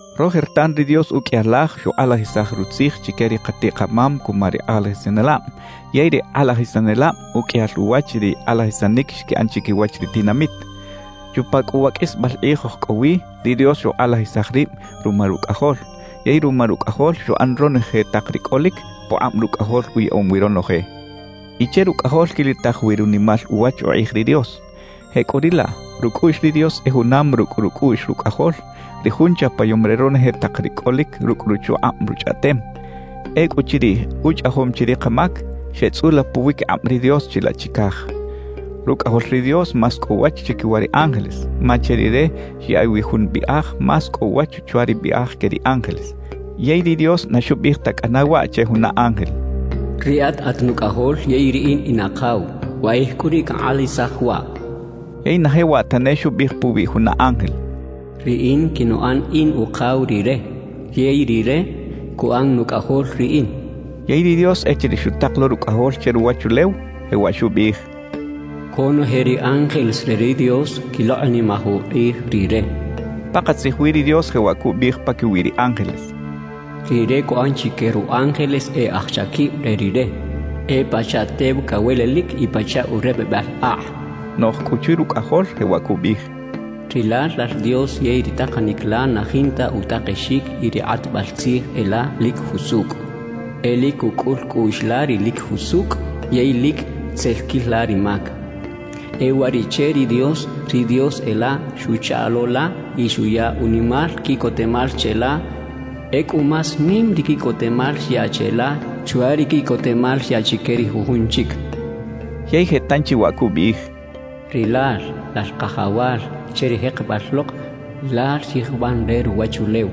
Rojertan ri Dios uqꞌuiyal laj xukꞌalajisaj Rutzij chique ri katiꞌ-kamam cuma ri kꞌalajisanelab, yey ri kꞌalajisanelab uqꞌuiyal uwach ri kꞌalajisanic xquiꞌan chiquiwach ri tinamit. Chupa cꞌu wa qꞌuisbal kꞌij oj cꞌo wi, ri Dios xukꞌalajisaj rib ruma Rucꞌajol. Yey ruma Rucꞌajol xuꞌan ronoje tak ri cꞌolic, pukꞌab Rucꞌajol uyaꞌom wi ronoje y che Rucꞌajol quilitaj wi runimal uwach ukꞌij ri Dios. Jecꞌuriꞌlaꞌ, rucꞌuꞌx ri Dios e junam rucꞌ rucꞌuꞌx Rucꞌajol, ri Jun chapayom re ronoje tak ri cꞌolic rucꞌ ruchukꞌab Ruchꞌaꞌtem. Ecꞌuchiriꞌ uchꞌajom chi ri kamac, xeꞌtzꞌula puwiquikꞌab ri Dios chilaꞌ chicaj. Rucꞌajol ri Dios más cꞌo uwach chiquiwa ri ángeles, ma che Rire xyaꞌiꞌ wi jun biꞌaj más cꞌo uwach chwa ri biꞌaj que ri ángeles. Yey ri Dios na xubiꞌij ta cꞌana waꞌ che juna ángel: Riꞌat at Nucꞌajol yey Riꞌin in Akaw; wakꞌij cꞌu riꞌ cankꞌalajisaj waꞌ. Yey na jewaꞌ tane xubiꞌij puwi juna ángel: Riꞌin quinuꞌan in Ukaw Rire yey Rire cuꞌan Nucꞌajol Riꞌin. Yey ri Dios echiriꞌ xutak lo Rucꞌajol che ruwachulew, jewaꞌ xubiꞌij: «Conoje ri ángeles re ri Dios quilokꞌnimaj ukꞌij Rire» xchaꞌ. Pakatzij wi ri Dios jewaꞌ cubiꞌij paquiwi ri ángeles: Rire cuꞌan chique ru ángeles e aj chaquib re Rire, e pachaꞌ tew cawelelic y pachaꞌ urepebal akꞌ cachaꞌ. Noꞌj cꞌu chwi Rucꞌajol jewaꞌ cubiꞌij: Rilal, Lal Dios yey ri takanic la na jinta utakexic y ri kꞌatbal tzij e la, lic jusucꞌ. E lic cucꞌul cꞌuꞌx la ri lic jusucꞌ yey lic tzel quil la ri mac. E uwariꞌche ri Dios, ri Dios e la, xuchaꞌ lo la y xuya unimal quiꞌcotemal cheꞌla; ecꞌu más nim ri quiꞌcotemal xyaꞌ cheꞌla chwa ri quiꞌcotemal xyaꞌ chique ri jujun chic cachaꞌ. Yey je tanchi waꞌ cubiꞌij: Rilal, Lal Kajawal, che ri jekebal lok Lal xyijban re ruwachulew;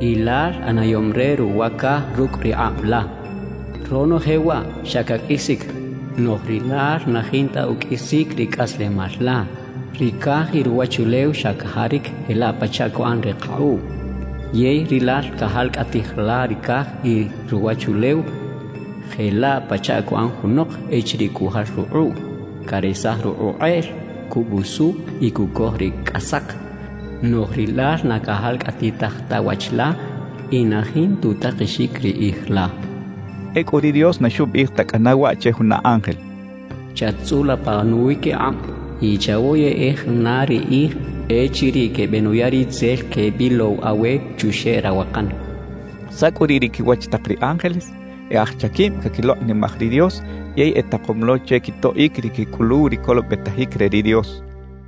y Lal ꞌanayom re ruwa caj rucꞌ ri kꞌab la. Ronoje waꞌ, xa caqꞌuisic, noꞌj Rilal na jinta uqꞌuisic ri cꞌaslemal la. Ri caj y ruwachulew xa cajaric jelaꞌ pachaꞌ cuꞌan ri kakꞌuꞌ. Yey Rilal cajalcꞌatij la ri caj y ruwachulew, jelaꞌ pachaꞌ cuꞌan junok echiriꞌ cujal rukꞌuꞌ: caresaj rukꞌuꞌ kꞌeꞌl, cubusu y cucoj ri cꞌasak. Noꞌj Rilal na cajalcꞌatitaj ta wach la y na jinta utakexic ri kꞌij la cachaꞌ. Ecꞌu ri Dios na xubiꞌij ta cꞌana waꞌ che juna ángel: Chat-tzꞌula pa nuwiquikꞌab, y chawoyeꞌej na ri kꞌij echiriꞌ quebenuya ri tzel quebilow awe chuxeꞌ rawakan. ¿Saꞌ cꞌu riꞌ ri quiwach tak ri ángeles? E aj chaquib caquilokꞌnimaj ri Dios yey etakom lo che quitoꞌic ri quecꞌuluw ri colobetajic re ri Dios.